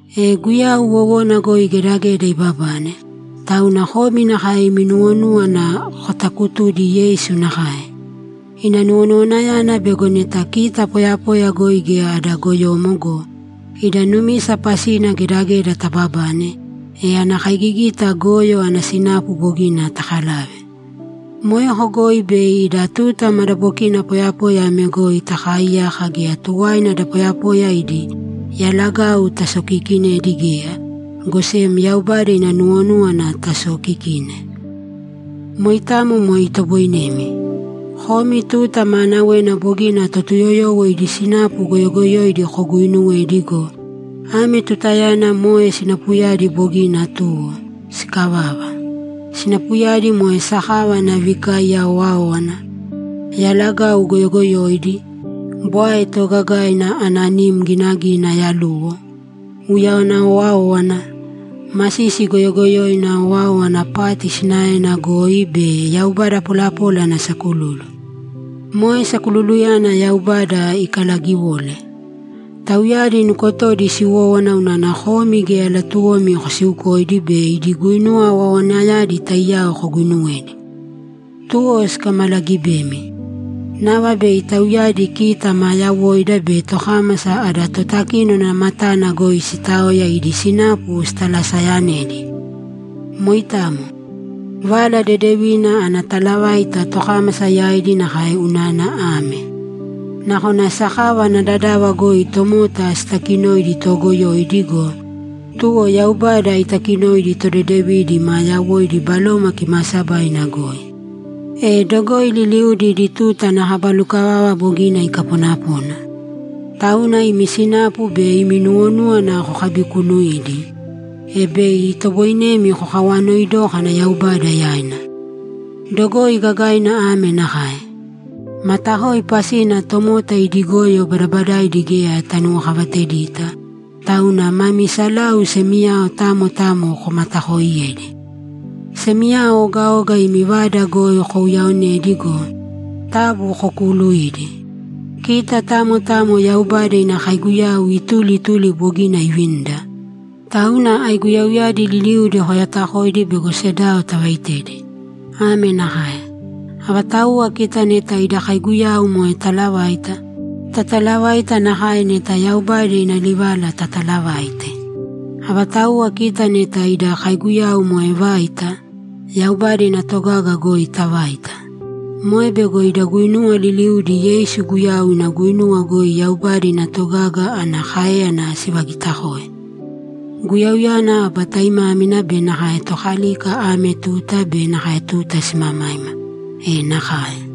E Guyau wowona goi gedageda ibabane, tauna komi nakae imi nuwonúwana kotakutūdi Yeisu nakae. Ina nuwonuwanayana bego neta kita poyapoya goi geya ada goyomo go, ida numisa pasina gedageda tababane, e ana kaigigita goyo ana sinapu bogina takalave. Moeko goi bei ida tuta madabokina poyapoya ame goi takaaiyaka geya tuwaina da poyapoya idi yalagau tasokiikinēdi geya, go sem Yaubada ina nuwonúwana tasookikīne. Moitamo moe itoboinemi. Komi tuta maanawena bogina Totuyoyowo idi sinapu goyogoyoidi koguuinuwedi go, ame tutayana moe sinapuyadi bogina tuwo, sikavava. Sinapuyadi moe sakava ana vikaiya owáowana, yalagau goyogoyoidi, bwae toogagaina ana nim ginagina yaluwo, uyawana owáowana, masisi goyogoyoina owáowana pati sinaena goi be yaubada polapola ana sakululu. Moe sakululuyana Yaubada ikalagiwole. Tauyadi nukotodi siwówana unana komi geya latuwomi kosiukoidi be idi guinuwa owaowanayadi taiyao koguinuwedi. Tuwo sikamalagibemi. Nava bei tauyadi kita maa yawoida be tokámasa adi Totakínona matana goi sitaoya idi sinapu sitalaseyanedi. Moitamo. Vala Dedevina ana talavaita tokámasa yaidi nakae unana ame: Nakona sakava ana dadava goi tomota sitakinoidi toogoyoidi go, tuwo Yaubada itakinoidi todedevidi maa yawoidi Baloma Kimaasabaina goi. E dogoi liliudi idi tuta ana kaba lukavava bogina ikaponapona. Tauna imi sinapu be imi nuwonúwana kokabikuunuīdi, e bei itoboinemi kokawanoi dókana Yaubada yaina. Dogoi gagaina ame nakae: Matakoi pasina tomota idi goyo badabadaidi geya tanuwokavatedita, tauna mami salau semiyao tamo tamo komatakooiyēdi. Semiyao ogaoga imi vada goi kouyaaonēdi go, taabu kokuuluīdi. Kita tamo tamo Yaubada ina kaiguyau ituli ituli bogina ivinida, tauna aiguyauyadi liliudi koyatakoidi bego sedao tavaitedi. Ame nakae: Avatauwa kita neta ida kaiguyau moe talavaita, tatalavaita nakae neta Yaubada ina livala tatalavaite. Avatauwa kita neta ida kaiguyau moe vaita, Yaubada ina togaga goi tavāita. Moe bego ida guinuwa liliudi Yeisu Guyau ina guinuwa goi Yaubada ina togaga ana káeyana sivagitakoe. Guyauyana aba taimámina be nakae Tokalika ame tuta be nakae tuta simamaima! E nakae!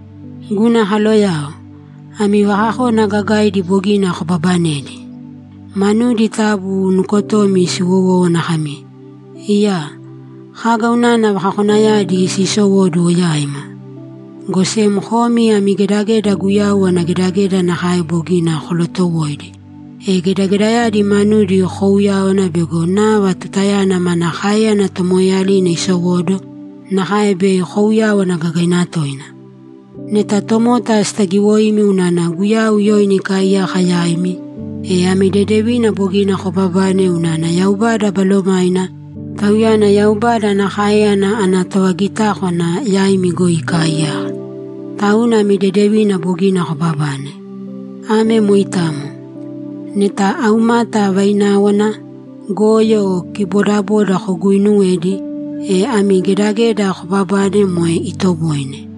Guna kaloyao, ami vakakona gagaidi bogina kobaabanedi. Manudi taabu nukotomi siwowōwana kami, ‘Iyaa, kaga unana vakakonayadi siisowóduwo yaima?’ Go sem komi ami gedageda Guyau ana gedageda nakae bogina kolootowoidi, e gedagedayadi manudi koouyāwana bego nava tutayana mana káeyana tomoeeyalina isowóduwo nakae bei kouyáwana gagaina toina. Neta tomota sitagiwoimi unana Guyau yoina ikaaiyaka yaimi, e ami dedevina bogina kobabane unana Yaubada Balomaina, Tauyana Yaubada ana káeyana ana tovagitákwana, yaimi goi ikaaiyaka. Tauna ami dedevina bogina kobabane. Ame moitamo. Neta aumata, vaináwana, goyo o kibodaboda koguuinuwedi, e ami gedageda koobabane moe itoboine.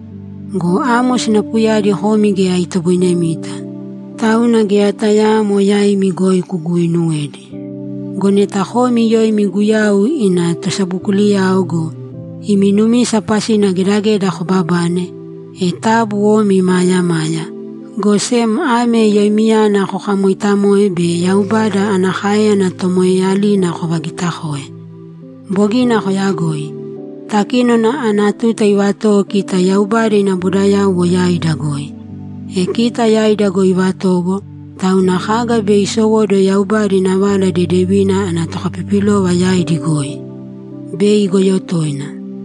Go amo sinapuyadi komi geya itoboinemita, tauna geya tayaamo yaimi goi kuguuinuwēdi. Go neta komi yoimi Guyau ina tosabokuliyao go, imi numisa pasina gedageda koobabane, e taabu omi imaayamāya, go sem ame yoimiyana kokamooitamōe be Yaubada ana káeyana tomoeeyalina kovagiitakōe. Bogina koyagoi. Takínona ana tuta ivatowo kita Yaubada ina bodayauwo yaida goi. E kita yaida goi ivatowo, tauna kaga bei isowóduwo Yaubada ina Vala Dedevina ana tokapipilova yaidi goi? Bei igoyo toina!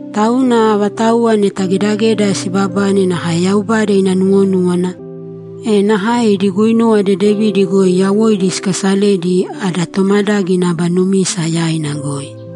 Tauna avatauwa neta gedageda siibabane nakae Yaubada ina nuwonúwana, e nakae idi guinuwa dedevidi goi yawoidi sikaasalēdi ada tomadágina aba numisa yaina goi.